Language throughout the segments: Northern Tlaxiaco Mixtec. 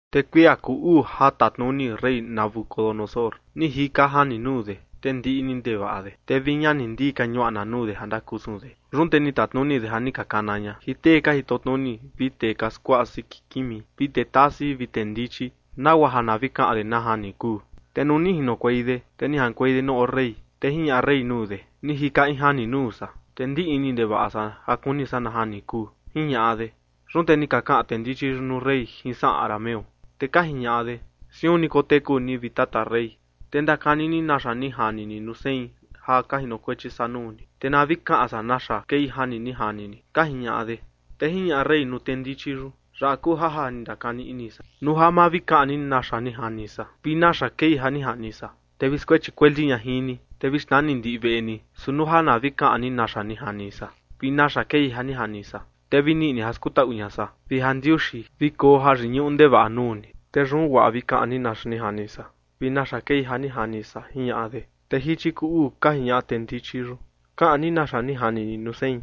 Te kuia kuu uu ja tatnuni rey Nabucodonosor, ni jika jani nuu de, te ndiꞌni ndevaꞌa de, te vi ña ni ndii ka ñuaꞌna nuu de ja ndakusun de. Yun te ni tatnuni de ja ni ka kana ña jin tee ka jitotnuni vi tee ka skuaꞌa siki kimi vi tee tasi vi tee ndichi, nagua ja na vi kaꞌan de na jani kuu. Te nuu ni jinokuei de, te ni jaꞌankuei de nuu oo rey. Te jiñaꞌa rey nuu de: ―Ni jika in jani nuu san, te ndiꞌni ndevaꞌa san ja kuni san na jani kuu ―jiñaꞌa de. Yun te ni ka kaꞌan tee ndichi yun nuu rey jin saꞌan arameo, te ka jiñaꞌa de: ―Siun ni koteku ni, vi tata rey. Te ndakani ni naxa ni jani ni nuu sein ja ka jinokuechi san nuu ni, te na vi kaꞌan san naxa kei jani ni jani ni ―ka jiñaꞌa de. Te jiñaꞌa rey nuu tee ndichi yun: ―Yaꞌa kuu ja ja ni ndakani ini san: Nuu ja ma vi kaꞌan ni naxa ni jani san vi naxa kei ja ni jani san, te vi skuechi kueli ña jin ni, te vi xnani ndiꞌi veꞌe ni. Su nuu ja na vi kaꞌan ni naxa ni jani san vi naxa kei ja ni jani san, te vi niꞌi ni ja skutaꞌu ña san vi jandiuxi, vi koo jayiñuꞌu ndevaꞌa nuu ni. Te yun guaa vi kaꞌan ni naxa ni jani san vi naxa kei ja ni jani san ―jiñaꞌa de. Te jichi kuu uu ka jiñaꞌa tee ndichi yun: ―Kaꞌan ni naxa ni jani ni nuu sein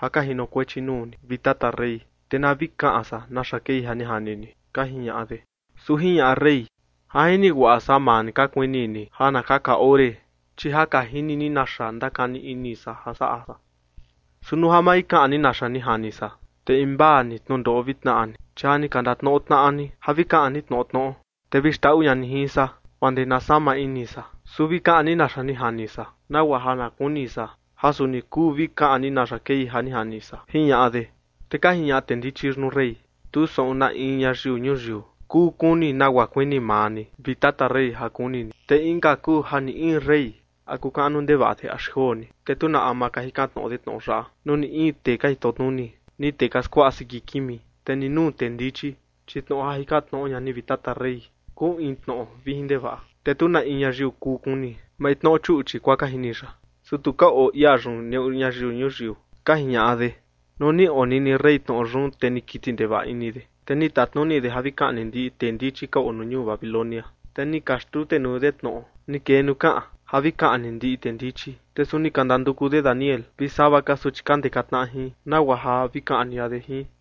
ja ka jinokuechi nuu ni, vi tata rey, te na vi kaꞌan san naxa kei ja ni jani ni ―ka jiñaꞌa de. Su jiñaꞌa rey: ―Ja jini guaꞌa san ja maa ni ka kuini ni ja na kaka ore, chi ja ka jini ni naxa ndakani ini san ja saꞌa san. Su nuu ja ma vi kaꞌan ni naxa ni jani san, te invaa ni tnundoꞌo vi tnaꞌa ni, chi ja ni ka ndatnoꞌo tnaꞌa ni ja vi kaꞌan ni tnoꞌo tnoꞌo, te vi xndaꞌu ña ni jin san, guaa ndee na sama ini san. Su vi kaꞌan ni naxa ni jani san, nagua ja na kuni san ja suni kuu vi kaꞌan ni naxa kei ja ni jani san ―jiñaꞌa de. Te ka jiñaꞌa tee ndichi yun nuu rey: ―Tu saꞌun na in ñayiu ñuyiu kuu kuni nagua kuini maa ni, vi tata rey, ja kuni ni. Te inka kuu ja ni in rey, a kuu kaꞌnu ndevaꞌa de axi joo ni, te tu na ama ka jikan tnoꞌo de tnoꞌo yaꞌa nuu ni in tee ka jitotnuni, ni tee ka skuaꞌa siki kimi, te ni nuu tee ndichi. Chi tnoꞌo ja jikan tnoꞌo ña ni, vi tata rey, kuu in tnoꞌo vijin ndevaꞌa, te tu na in ñayiu kuu kuni. Maintnoꞌo chuꞌchi, guaa ka jini ya, su tu ka oo ia yun neꞌu ñayiu ñuyiu ―ka jiñaꞌa de. Nuu ni onini rey tnoꞌo yun, te ni kiti ndevaꞌa ini de, te ni tatnuni de ja vi kaꞌni ndiꞌi tee ndichi ka oo ñuu Babilonia. Te ni ka xtutenuu de tnoꞌo ni kee nuu kaꞌan ja vi kaꞌni ndiꞌi tee ndichi, te suni ni ka ndanduku de Daniel vi sava ka suchi ka ndeka tnaꞌa jin, nagua ja vi kaꞌni ña de jin.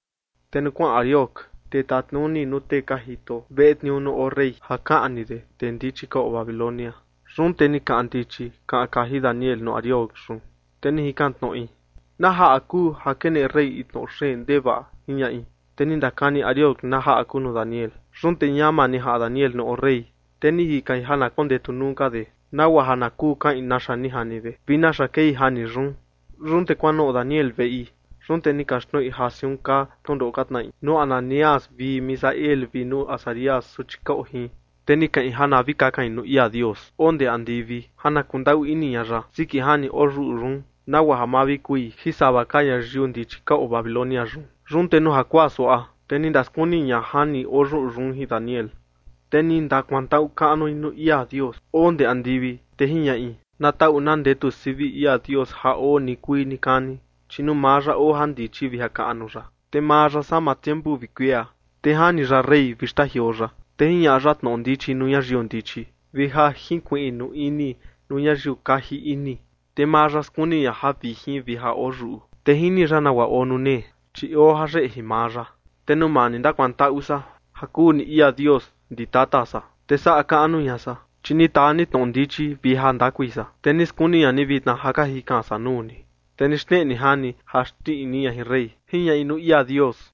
Te nuu kuaꞌan Arioc, tee tatnuni nuu tee ka jito veꞌe tniuu nuu oo rey, ja kaꞌni de tee ndichi ka oo Babilonia, yun te ni kaꞌan ndichi kaꞌan kaji Daniel nuu Arioc yun, te ni jikan tnoꞌi: ―¿Na jaꞌa kuu ja keneꞌe rey in tnoꞌo xeen ndevaꞌa? ―jiñaꞌi. Te ni ndakani Arioc na jaꞌa kuu nuu Daniel. Yun te ñama ni jaꞌan Daniel nuu oo rey, te ni jikain ja na kondetu nuu ka de, nagua ja na kuu kaꞌin naxa ni jani de vi naxa kei jani yun. Yun te kuanoꞌo Daniel veꞌi, te ni kaxtnoꞌi ja siun kaa tnundoꞌo ka tnaꞌi nuu Ananías vi Misael vi nuu Azarías, suchi ka oo jin. Te ni kaꞌin ja na vi kakain nuu ia Dios oo ndee andivi ja na kundaꞌu ini ña ya siki jani oyuꞌu yun, nagua ja ma vi kui jin sava ka ñayiu ndichi ka oo Babilonia yun. Yun te nuu jakuaa suaꞌa, te ni ndaskuni ña jani oyuꞌu yun jin Daniel, te ni ndakuantaꞌu kaꞌnui nuu ia Dios oo ndee andivi, te jiñaꞌi: Na taꞌu na ndetu sivi ia Dios ja oo nikuii nikani, chi nuu maa ya oo jandichi vi jakaꞌnu ya. Te maa ya sama tiempu vi kuia, te jani ya rey vi xtajioo ya, te jiñaꞌa ya tnoꞌo ndichi nuu ñayiu ndichi vi ja jinkuiꞌnu ini nuu ñayiu kaji ini. Te maa ya skuni ña javijin vi ja oo yuꞌu, te jini ya nagua oo nuu nee chi oo jayeꞌe jin maa ya. Te nuu maa ni ndakuantaꞌu san ja kuu ni ia Dios ndi tata san, te saꞌa kaꞌnu ña san, chi ni taa ni tnoꞌo ndichi vi jandakui san, te ni skuni ña ni vitna ja ka jikan san nuu ni, te ni xneꞌe ni jani ja xndiꞌni ña jin rey. Jiñaꞌi nuu ia Dios.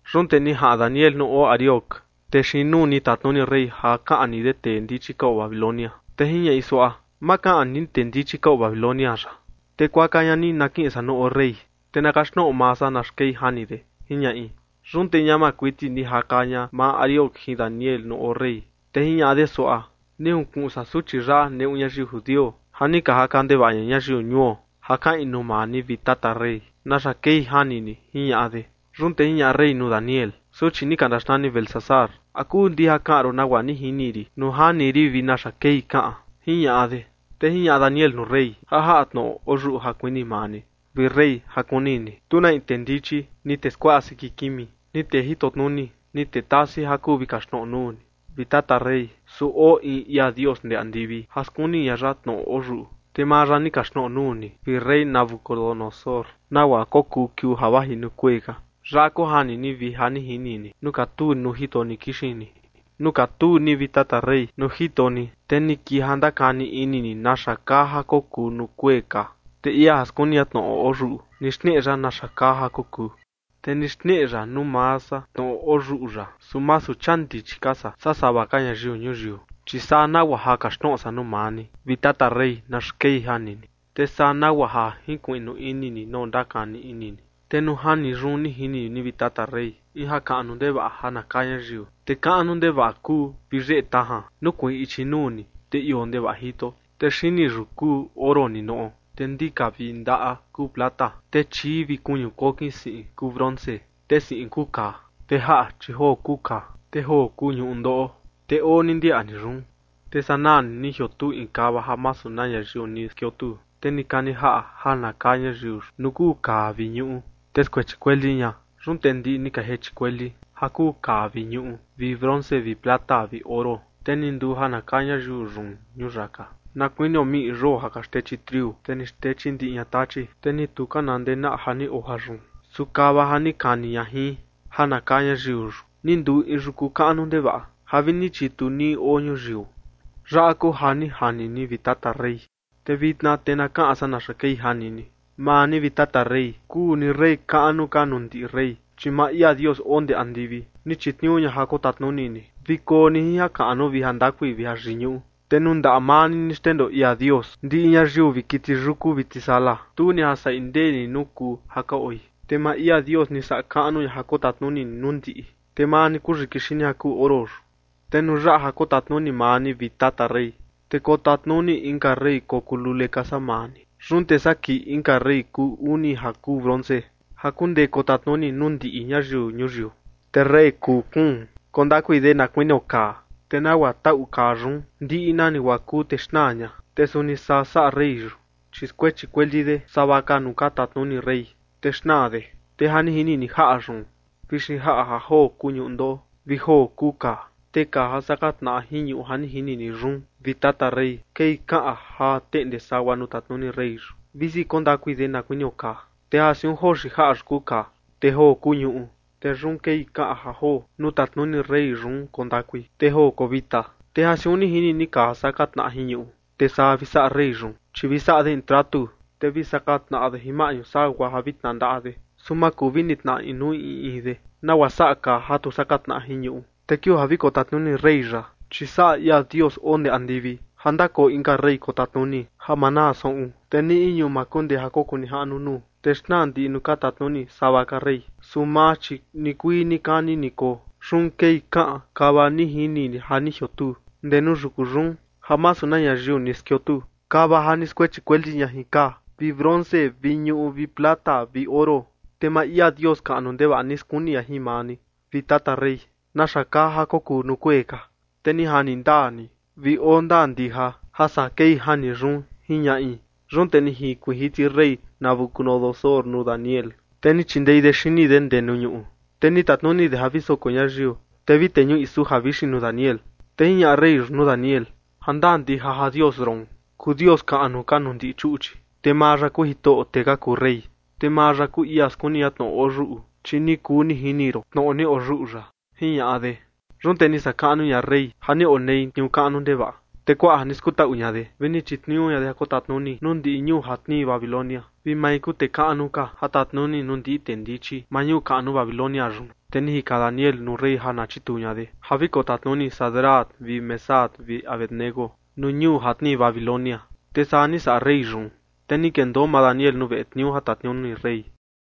Yun te ni jaꞌan Daniel nuu oo Arioc, tee xiin nuu ni tatnuni rey ja kaꞌni de tee ndichi ka oo Babilonia, te jiñaꞌi suaꞌa: ―Ma kaꞌni ni tee ndichi ka oo Babilonia yaꞌa. Te kuaka ña ni na kiꞌin san nuu oo rey, te na kaxtnoꞌo maa san naxa kei jani de ―jiñaꞌi. Yun te ñama kuiti ni jaka ña maa Arioc jin Daniel nuu oo rey, te jiñaꞌa de suaꞌa: ―Ni junkuꞌun san suchi yaꞌa neꞌu ñayiu judio ja ni ka jaka ndevaꞌa ña ñayiu ñuo, ja kaꞌin nuu maa ni, vi tata rey, naxa kei jani ni ―jiñaꞌa de. Yun te jiñaꞌa rey nuu Daniel, suchi ni ka ndaxnani Beltsasar: ―¿A kuu ndija kaꞌan ron nagua ni jini rin nuu jani rin vi naxa kei kaꞌan? ―jiñaꞌa de. Te jiñaꞌa Daniel nuu rey: ―Ja jaꞌa tnoꞌo oyuꞌu ja kuini maa ni, vi rey, ja kuni ni, tu na in tee ndichi, ni tee skuaꞌa siki kimi, ni tee jitotnuni, ni tee tasi ja kuu vi kaxtnoꞌo nuu ni, vi tata rey. Su oo in ia Dios ndee andivi ja skuni ña ya tnoꞌo oyuꞌu, te maa ya ni kaxtnoꞌo nuu ni, vi rey Nabucodonosor, nagua kokuu kiuu ja vaji nuu kuee ka. Yaꞌa kuu jani ni vi ja ni jini ni nuu katuu ni nuu jito ni kixin ni. ’Nuu katuu ni, vi tata rey, nuu jito ni, te ni kii ja ndakani ini ni naxa kaa ja kokuu nuu kuee ka. Te ia ja skuni ña tnoꞌo oyuꞌu ni xneꞌe ya naxa kaa ja kokuu. Te ni xneꞌe ya nuu maa san tnoꞌo oyuꞌu yaꞌa, su masu chia ndichi ka san saa sava ka ñayiu ñuyiu, chi saa nagua ja kaxtnoꞌo san nuu maa ni, vi tata rey, naxa kei jani ni, te saa nagua ja jinkuiꞌnu ini ni nagua ndakani ini ni. ’Te nuu jani yun ni jini ni, vi tata rey, in jakaꞌnu ndevaꞌa ja na kaa ñayiu. Te kaꞌnu ndevaꞌa kuu vi yeꞌe tajan, nukuiin ichi nuu ni, te ioo ndevaꞌa jito. Te xini yun kuu oro ninoꞌo, te ndika vi ndaꞌa kuu plata, te chii vi kuñu kokin siꞌin kuu bronce. Te siꞌin kuu kaa. Te jaꞌa, chi joo kuu kaa, te joo kuu ñuꞌu ndoꞌo. Te oo ni ndiaꞌa ni yun, te sanaa ni jiotuu in kava ja masu na ñayiu ni skiotuu. Te ni kani jaꞌa ja na kaa ñayiu yun nuu kuu kaa vi ñuꞌu, te skuechi kueli ña. Yun te ndiꞌi ni ka jechi kueli ja kuu kaa vi ñuꞌu vi bronce vi plata vi oro. Te ni nduu ja na kaa ñayiu yun ñuyaka na kuinio miꞌi yoo ja ka xtechi triu, te ni xtechi ndiꞌi ña tachi, te ni tu ka na ndenaꞌa ja ni oo jayun. Su kava ja ni kani ña jin ja na kaa ñayiu yun, ni nduu in yuku kaꞌnu ndevaꞌa ja vi ni chitu nii oo ñuyiu. ’Yaꞌa kuu ja ni jani ni, vi tata rey. Te vitna te na kaꞌan san naxa kei jani ni. Maa ni, vi tata rey, kuu ni rey kaꞌnu ka nuu ndiꞌi rey, chi maa ia Dios oo ndee andivi ni chitniuu ña ja kotatnuni ni, vi koo ni jin jakaꞌnu vi jandakui vi jayiñuꞌu. Te nuu ndaꞌa maa ni, ni xndendoo ia Dios ndiꞌi ñayiu vi kiti yuku vi tisala, tu ni ja saꞌi ndeni nuu kuu ja ka oi. Te maa ia Dios ni saꞌa kaꞌnu ña ja kotatnuni ni nuu ndiꞌi. Te maa ni kuu yiki xini ja kuu oro yun. Te nuu yaꞌa ja kotatnuni maa ni, vi tata rey, te kotatnuni inka rey kokuu lule ka saa maa ni. Yun te saa kii inka rey kuu uni ja kuu bronce, ja kundee kotatnuni nuu ndiꞌi ñayiu ñuyiu. Te rey kuu kuun koo ndakui de na kuinio kaa, te nagua taꞌu kaa yun ndiꞌi nani guaa kuu te xnaa ña, te suni saa saꞌa rey yun, chi skuechi kueli de sava ka nuu ka tatnuni rey, te xnaa de. ’Te ja ni jini ni jaꞌa yun vi xinjaꞌa ja joo kuu ñuꞌu ndoꞌo vi joo kuu kaa. Te kaa ja saka tnaꞌa jin ñuꞌu ja ni jini ni yun, vi tata rey, kei kaꞌan ja teꞌnde sagua nuu tatnuni rey yun, visi koo ndakui de na kuinio kaa. Te ja siun joo xinjaꞌa yun kuu kaa, te joo kuu ñuꞌu, te yun kei kaꞌan ja joo nuu tatnuni rey yun koo ndakui, te joo koo vita. Te ja siun ni jini ni kaa ja saka tnaꞌa jin ñuꞌu, te saa vi saꞌa rey yun, chi vi saꞌa de in tratu, te vi saka tnaꞌa de jin maꞌñu sagua ja vi tnandaꞌa de, su ma kuu vi nitnaꞌa inuu in in de, nagua saꞌa kaa ja tu saka tnaꞌa jin ñuꞌu. Te kiuu ja vi kotatnuni rey yaꞌa, chi saꞌa ia Dios oo ndee andivi ja ndakoo inka rey kotatnuni ja ma naa saꞌun. Te ni in ñuu ma kundee ja kokuu nijaꞌnu nuu, te xnaa ndiꞌi nuu ka tatnuni sava ka rey. Su maa, chi nikuii nikani ni koo. Yun kei kaꞌan kava ni jini ni ja ni jiotuu ndee nuu yuku yun ja masu na ñayiu ni skiotuu, kava ja ni skuechi kueli ña jin kaa vi bronce vi ñuꞌu vi plata vi oro. Te maa ia Dios kaꞌnu ndevaꞌa ni skuni ña jin maa ni, vi tata rey, naxa kaa ja kokuu nuu kuee ka. Te ni jani ndaa ni vi oo ndaa ndija ja saa kei jani yun ―jiñaꞌi. Yun te ni jinkuiin jiti rey Nabucodonosor nuu Daniel, te ni chindei de xini de ndee nuu ñuꞌu, te ni tatnuni de ja vi soko ñayiu, te vi teñuꞌi suja vixin nuu Daniel. Te jiñaꞌa rey yun nuu Daniel: ―Ja ndaa ndija ja Dios ron kuu Dios kaꞌnu ka nuu ndiꞌi chuꞌchi, te maa ya kuu Jitoꞌo tee ka kuu rey, te maa ya kuu ia skuni ña tnoꞌo oyuꞌu, chi ni kuu ni jini ron tnoꞌo ni oyuꞌu yaꞌa ―jiñaꞌa de. Yun te ni saꞌa kaꞌnu ña rey ja ni onei tniuu kaꞌnu ndevaꞌa, te kuaꞌa ja ni skutaꞌu ña de, vi ni chitniuu ña de ja kotatnuni nuu ndiꞌi ñuu ja tnii Babilonia, vi mai kuu tee kaꞌnu ka ja tatnuni nuu ndiꞌi tee ndichi maa ñuu kaꞌnu Babilonia yun. Te ni jikan Daniel nuu rey ja na chitniuu ña de ja vi kotatnuni Sadrac vi Mesac vi Abed-nego nuu ñuu ja tnii Babilonia, te saa ni saꞌa rey yun. Te ni kendoo maa Daniel nuu veꞌe tniuu ja tatnuni rey.